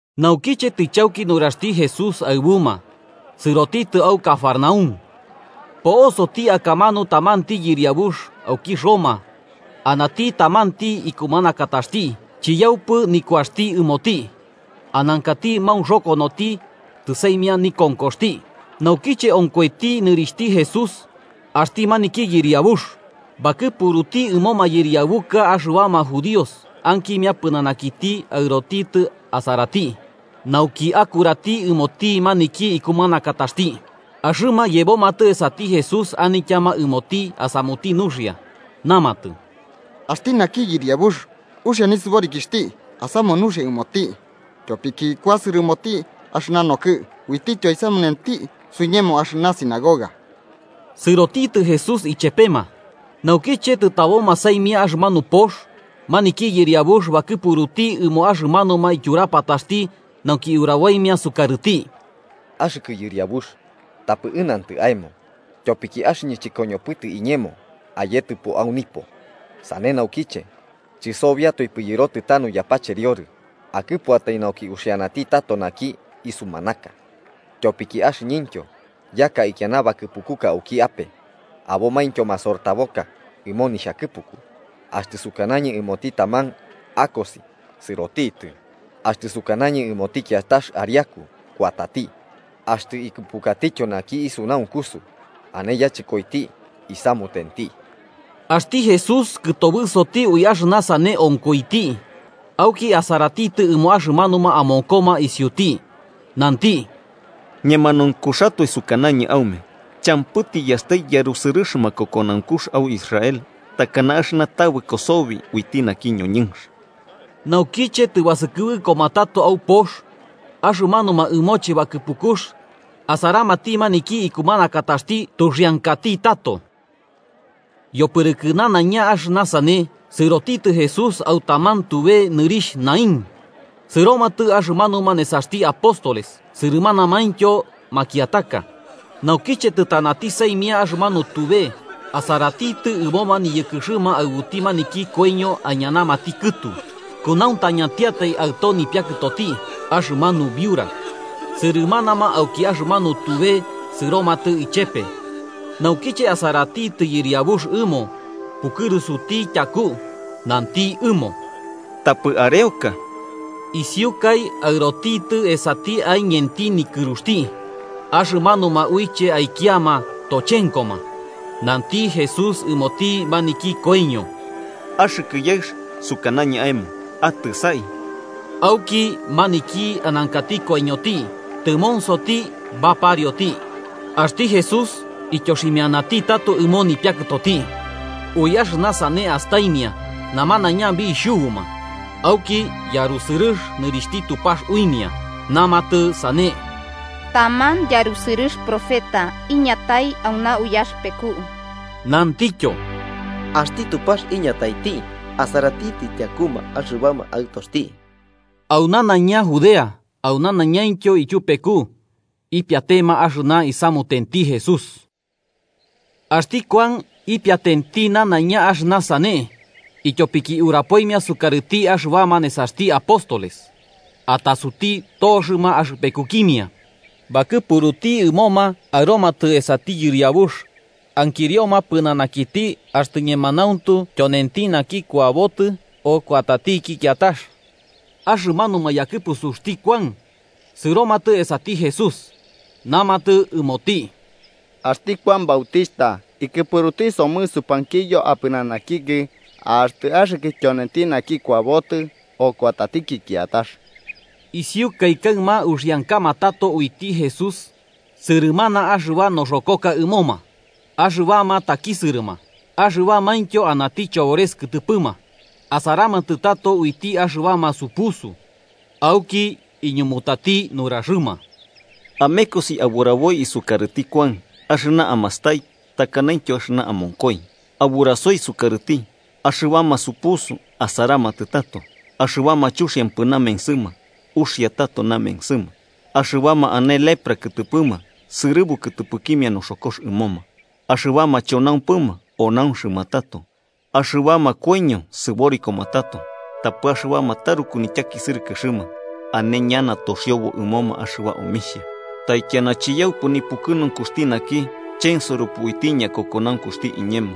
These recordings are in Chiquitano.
Naukiche tɨchauki nuraxti Jesús aɨbuma, sɨrotitɨ au Cafarnaúm. Po'osoti akamanu tamanti yɨriabux auki Roma anati tamanti ikumanakataxti chiyaupɨ nikuaxti ɨmoti, anankati maunxokonoti tɨsaimia nikonkoxti. Naukiche onkoiti nɨrixhti Jesús axti maniki yɨriabux, bakɨpuruti ɨmo mayɨriabuka axɨbama judíos ankimia pɨnanakiti aɨrotitɨ asarati nauki bakurarati ɨmoti maniki ikumanakataxti. Axɨma yebomatɨ esati Jesús anityama ɨmoti asamuti nuxia, namatɨ: –Axti naki yɨriabux uxia nisɨborikixhti asamu nuxia ɨmoti, tyopiki kuasɨrɨ ɨmoti axɨna nokɨ'ɨ uitityo aisamunenti suiñemo axɨna sinagoga. Sɨrotitɨ Jesús ichepema, naukiche tɨtaboma saimia axɨmanu pox, maniki yɨriabux bakɨpuruti ɨmo axɨmanuma tyurapataxti nauki uraboimia sukarɨti: “Axɨkɨ Yɨriabux, tapɨ ɨnantɨ aemo, tyopiki axɨñɨ chɨkoñopɨtɨ iñemo ayetɨpo au nipo. Sane naukiche, chɨsobiatoipɨ yɨrotanu yapacheriorɨ. Akɨpuatai nauki uxianati tato naki isumanaka. Tyopiki axɨñɨntyo yaka ikiana bakɨpukuka auki ape, abomaintyo masortaboka ɨmo nixhakɨpuku. Axtɨ sukanañɨ ɨmoti taman akosi, sɨrotitɨ. Axtɨ sukanañɨ ɨmoti kiatax ariaku, kuatati. Axtɨ ikɨpukatityo naki isunaunkusu ane yachɨkoiti, isamutenti.” Axti Jesús kɨtobɨsoti ui axɨna sane onkoiti, auki asaratitɨ ɨmo axɨmanuma amonkoma isiuti nanti: –Ñemanaunkuxatoe sukanañɨ aume champɨ tiyastai yarusɨrɨx makokonaunkux au Israel takana axɨna tabɨko sobi uiti naki ñoñɨnx. Naukiche tɨbasɨkɨbɨkoma tato au pox, axɨmanuma ɨmoche bakɨpukux asaramati maniki nikumanakataxti tuxiankati tato. Yopɨrɨkɨ nanaiña axɨna sane, sɨrotitɨ Jesús au taman tube nɨrixh Naín. Sɨromatɨ axɨmanuma nesaxti apóstoles sɨrɨmanamaintyo makiataka. Naukiche tɨtanati saimia axɨmanu tube, asaratitɨ ɨmoma niyɨkɨxɨma aɨbuti maniki koiño aiñanamati kɨtu, kunauntañatiatai aɨto nipiakɨtoti, axɨmanu biurax. Sɨrɨmanama auki axɨmanu tube sɨromatɨ ichepe. Naukiche asaratitɨ Yɨriabux ɨmo, pukɨrusuti tyaku nanti ɨmo: –Tapɨ areoka. Isiukai aɨrotitɨ esati aiñenti nikɨruxti, axɨmanuma uiche aikiama tochenkoma. Nanti Jesús ɨmoti maniki koiño: –Naki yaɨx, sukanañɨ aemo: ¡Atɨsai! Auki maniki anankati koiñoti tɨmonsoti baparioti, axti Jesús ityoximianati tato ɨmo nipiakɨtoti. Ui axɨna sane astaimia, namanaiña bixhubuma auki yarusɨrɨx nɨrixhti Tupax uimia, namatɨ sane: –Tamanti yarusɨrɨx profeta iñataiti auna uyaxɨpeku. Namatityo: –Axti Tupax iñataiti asaratitɨ tyakuma axɨbama aɨtoxti. Au nanaiña Judea au nanaiñaintyo ityupeku ipiatema axɨna isamutenti Jesús. Axti Kuan ipiatenti nanaiña axɨna sane, ityopiki urapoimia sukarɨti axɨbama nesaxti apóstoles. Atasuti toxɨma axɨpekukimia bakɨpuruti ɨmoma aɨromatɨ esati Yɨriabux, ankirioma pɨnanakiti axtɨ ñemanauntu tyonenti naki kuabotɨ o kuatatiki kiatax. Axɨmanuma yakɨpusuxti Kuan sɨromatɨ esati Jesús, namatɨ ɨmoti: –Axti Kuan Bautixhta ikɨpuruti somɨ supankiyo apɨnanakikɨ axtɨ axɨkɨ tyonenti naki kuabotɨ, o kuatatiki kiatax. Isiukai kaɨma uxiankama tato uiti Jesús sɨrɨmanama axɨba noxokoka ɨmoma axɨbama takisɨrɨma, axɨbamaintyo anati chobores kɨtɨpɨma, asaramatɨ tato uiti axɨbama supusu. Auki iñumutati nuraxɨma: –Amekosi aburaboi isukarɨti Kuan axɨna amastai takanaintyo axɨna amonkoi. Aburasoi sukarɨti axɨbama supusu asaramatɨ tato, axɨbama chuxiampɨ namensɨma uxia tato namensɨma, axɨbama ane lepra kɨtɨpɨma sɨrɨbu kɨtɨpɨkimia noxokox ɨmoma, axɨbama chonaumpɨma onaunxɨma tato, axɨbama koiño sɨborikoma tato tapɨ axɨbama taruku nityakisɨrɨkɨxɨma ane ñana toxiobo ɨmoma axɨba omixhia. ¡Taikiana chiyaupɨ nipukɨnunkuxti naki chensoropɨ uiti ñakokonaunkuxti iñemo!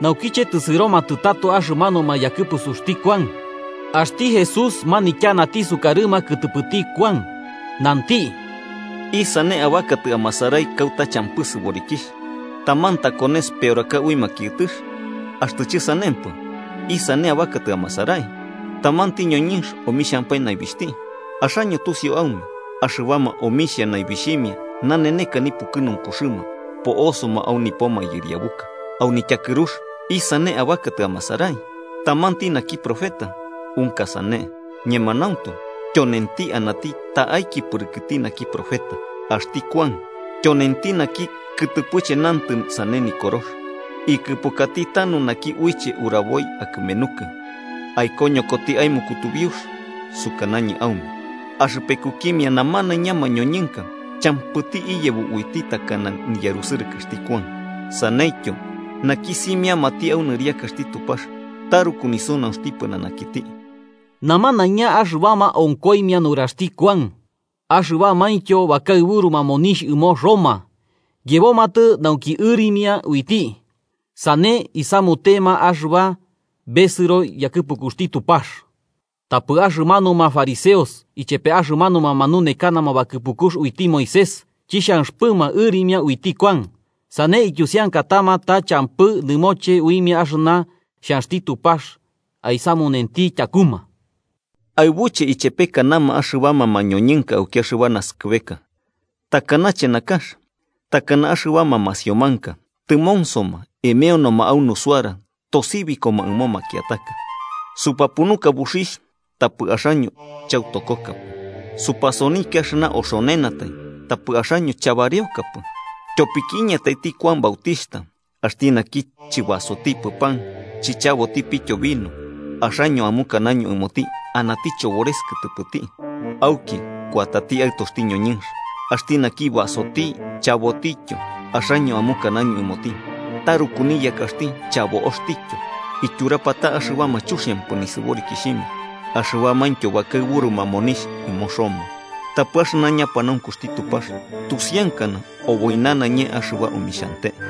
Naukiche tɨsɨromatɨ tato axɨmanuma yakɨpusuxti Kuan, axti Jesús manityanati sukarɨma kɨtɨpɨti Kuan, nanti: “¿Isane abakatɨ amasarai kauta champɨ sɨborikixh? ¿Taman takones peoraka ui makiɨtɨx? Axtɨ chɨsanempɨ, ¿isane abakatɨ amasarai? ¿Tamanti ñoñɨnx omixhampae naibixhti? Axaño tusiu aume axɨbama omixhia naibixhimia naneneka nipukɨnunkuxɨma, po'osoma au nipo mayɨriabuka. Au nityakɨrux, ¿isane abakatɨ amasarai? ¿Tamanti naki profeta? Unka sane, ñemanauntu, tyonenti anati ta'aiki pɨrɨkɨti naki profeta. Axti Kuan tyonenti naki kɨtɨpɨche nantɨ sane Nikorox: ‘Ikɨpukati tanu naki uiche uraboi akɨmenukɨ, aikoñokoti aemo kutubiux.’ Sukanañɨ aume, axɨpekukimia namanaiña mañoñɨnka, champɨti iyebo uiti takana niyarusɨrɨkɨxti Kuan. Saneityo, naki simiamati au nɨriakaxti Tupax taruku nisunaunxti pɨnanakiti.” Namanaiña axɨbama onkoimia nuxaxti Kuan, axɨbamaintyo bakaɨburuma monixh ɨmo Roma, yebomatɨ nauki ɨrimia uiti, sane isamutema axɨba besɨro yakɨpukuxti Tupax. Tapɨ axɨmanuma fariseos ichepe axɨmanuma manunekanama bakɨpukux uiti Moisés chixhanxɨpɨma ɨrimia uiti Kuan, sane ityusiankatama ta champɨ nɨmoche uimia axɨna xhanxti Tupax aisamunenti tyakuma. “¿Aɨbuche ichepekanama axɨbama mañoñɨnka auki axɨba naskɨbeka? ¿Takanache nakax? Takana axɨbama masiomanka tɨmonsoma emeoma au nusuara tosibikoma ɨmo makiataka: ‘Supapunuka buxixh, tapɨ axaño chautokokapɨ. Supasonikia axɨna oxonenatai, tapɨ axaño chabareokapɨ.’ Tyopiki iñataiti Kuan Bautixhta, axti naki chɨbasotipɨ pan chichabotipityo vino, axaño amukanaño ɨmoti anati chobores kɨtɨpɨti. Auki kuatati Aɨtoxti ñoñɨnx, axti naki basoti chabotityo, axaño amukanaño ɨmoti taruku niyakaxti chabo'oxtityo, ityurapata axɨbama chuxiampɨ nɨrixhimia axɨbamaintyo bakaɨburuma monixh ɨmo Roma. Tapɨ axɨna ñapanaunkuxti Tupax tusiankana oboi nanaiña axɨba omixhante.”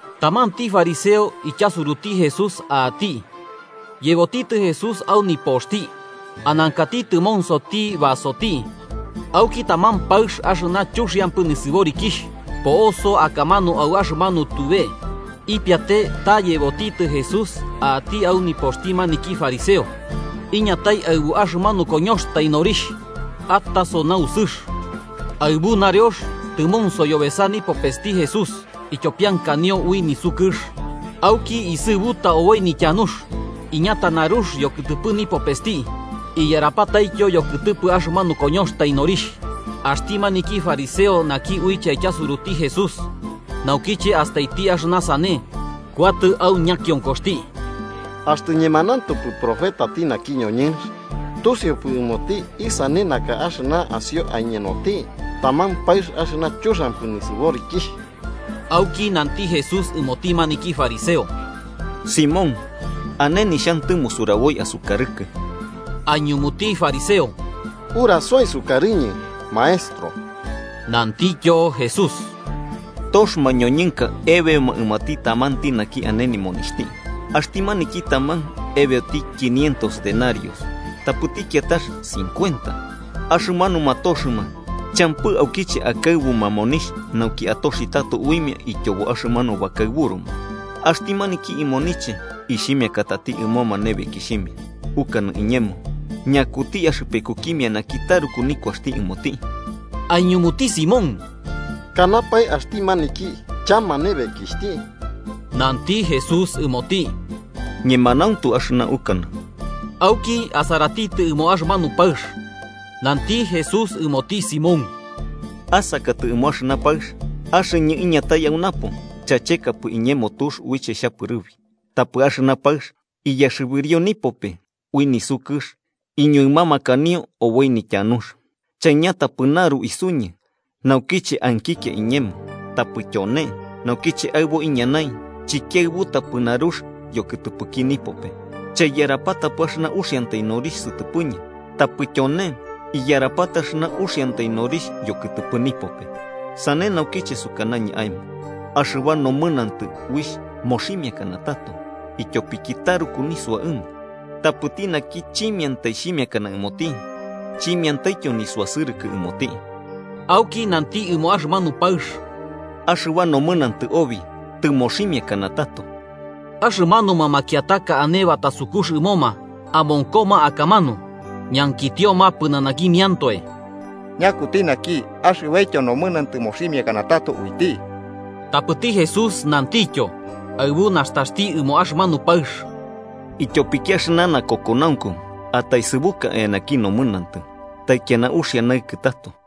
Tamanti fariseo ityasuruti Jesús a'ati, yebotitɨ Jesús au nipoxti. Anankati tɨmonsoti basoti, auki taman paɨx axɨna chuxiampɨ nisɨborikixh, po'oso akamanu au axɨmanu tube ipiate yebotitɨ Jesús a'ati au nipoxti maniki fariseo, iñatai aɨbu axɨmanu koñoxtai norixh ataso nausɨx. Aɨbu nareox, tɨmonso yobesa nipopesti Jesús ityopiankanio ui nisukɨx. Auki isɨbuta oboi nityanux, iñata narux yokɨtɨpɨ nipopesti iyarapataityo yokɨtɨpɨ axɨmanu koñoxtai norixh. Axti maniki fariseo naki uiche aityasuruti Jesús, naukiche astaiti axɨna sane, kuatɨ au ñakionkoxti: “Axtɨ ñemanauntupɨ profetati naki ñoñɨnx, tusiupɨ ɨmoti isane naka axɨna asio aiñenoti: taman paɨx axɨna chuxiampɨ nisɨborikixh.” Auki nanti Jesús ɨmoti maniki fariseo: –Simón, ane nixhantɨmo suraboi asukarɨkɨ. Aiñumuti fariseo: –Urasoi sukarɨñɨ, maestro. Nantikityo Jesús: –Tox mañoñɨnka ebeoma ɨmoti tamanti naki ane nimonixhti. Axti maniki taman ebeoti quinientos denarios, tapɨti kiatax cincuenta. Axɨmanuma toxɨma champɨ aukiche akaɨbuma monixh nauki atoxi tato uimia ityobo axɨmanu bakaɨburuma, axti maniki imoniche ixhimiakatati ɨmoma nebekixhimia. Ukanɨ iñemo, ¿ñakuti axɨpekukimia naki taruku nikuaxti ɨmoti? Aiñumuti Simón: –Kanapae axti maniki chama nebekixhti. Nanti Jesús ɨmoti: –Ñemanauntu axɨna ukanɨ. Auki, asaratitɨ ɨmo axɨmanu paɨx, nanti Jesús ɨmoti Simón: –¿Asakatɨ ɨmo axɨna paɨx? Axɨñɨ iñatai au napo, chachekapɨ iñemo tux uiche xhapɨrɨbi. Tapɨ axɨna paɨx, iyaxɨbirio nipope ui nisukɨx iñuɨmamakanio oboi nityanux. Chaiñatapɨ naru isuñɨ naukiche ankikia iñemo, tapɨ tyone, naukiche aɨbo iñanai, chikiaɨbutapɨ narux yokɨtɨpɨki nipope. Chaiyarapatapɨ axɨna uxiantai norixh sɨtɨpɨñɨ, tapɨ tyone iyarapata axɨna uxiantai norixh yokɨtɨpɨ nipope. Sane naukiche sukanañɨ aemo axɨba nomɨnantɨ uixh moximiakana tato, ityopiki taruku nisua ɨmo. Tapɨti naki chimiantai xhimiakana ɨmoti, chimiantai nisuasɨrɨkɨ ɨmoti. Auki nanti ɨmo axɨmanu paɨx: –Axɨba nomɨnantɨ obi tɨmoximiakana tato. Axɨmanuma makiataka ane batasukux ɨmoma amonkoma akamanu, ñankitioma pɨnanakimiantoe: –¿Ñakuti naki, axɨbaityo nomɨnantɨ moximiakana tato uiti? Tapɨti Jesús nantityo, asaratitɨ ɨmo axɨmanu paɨx: –Ityopiki axɨna nakokonaunku ataesɨbuka eanaki nomɨnantɨ. Taikiana uxia naɨkɨ tato.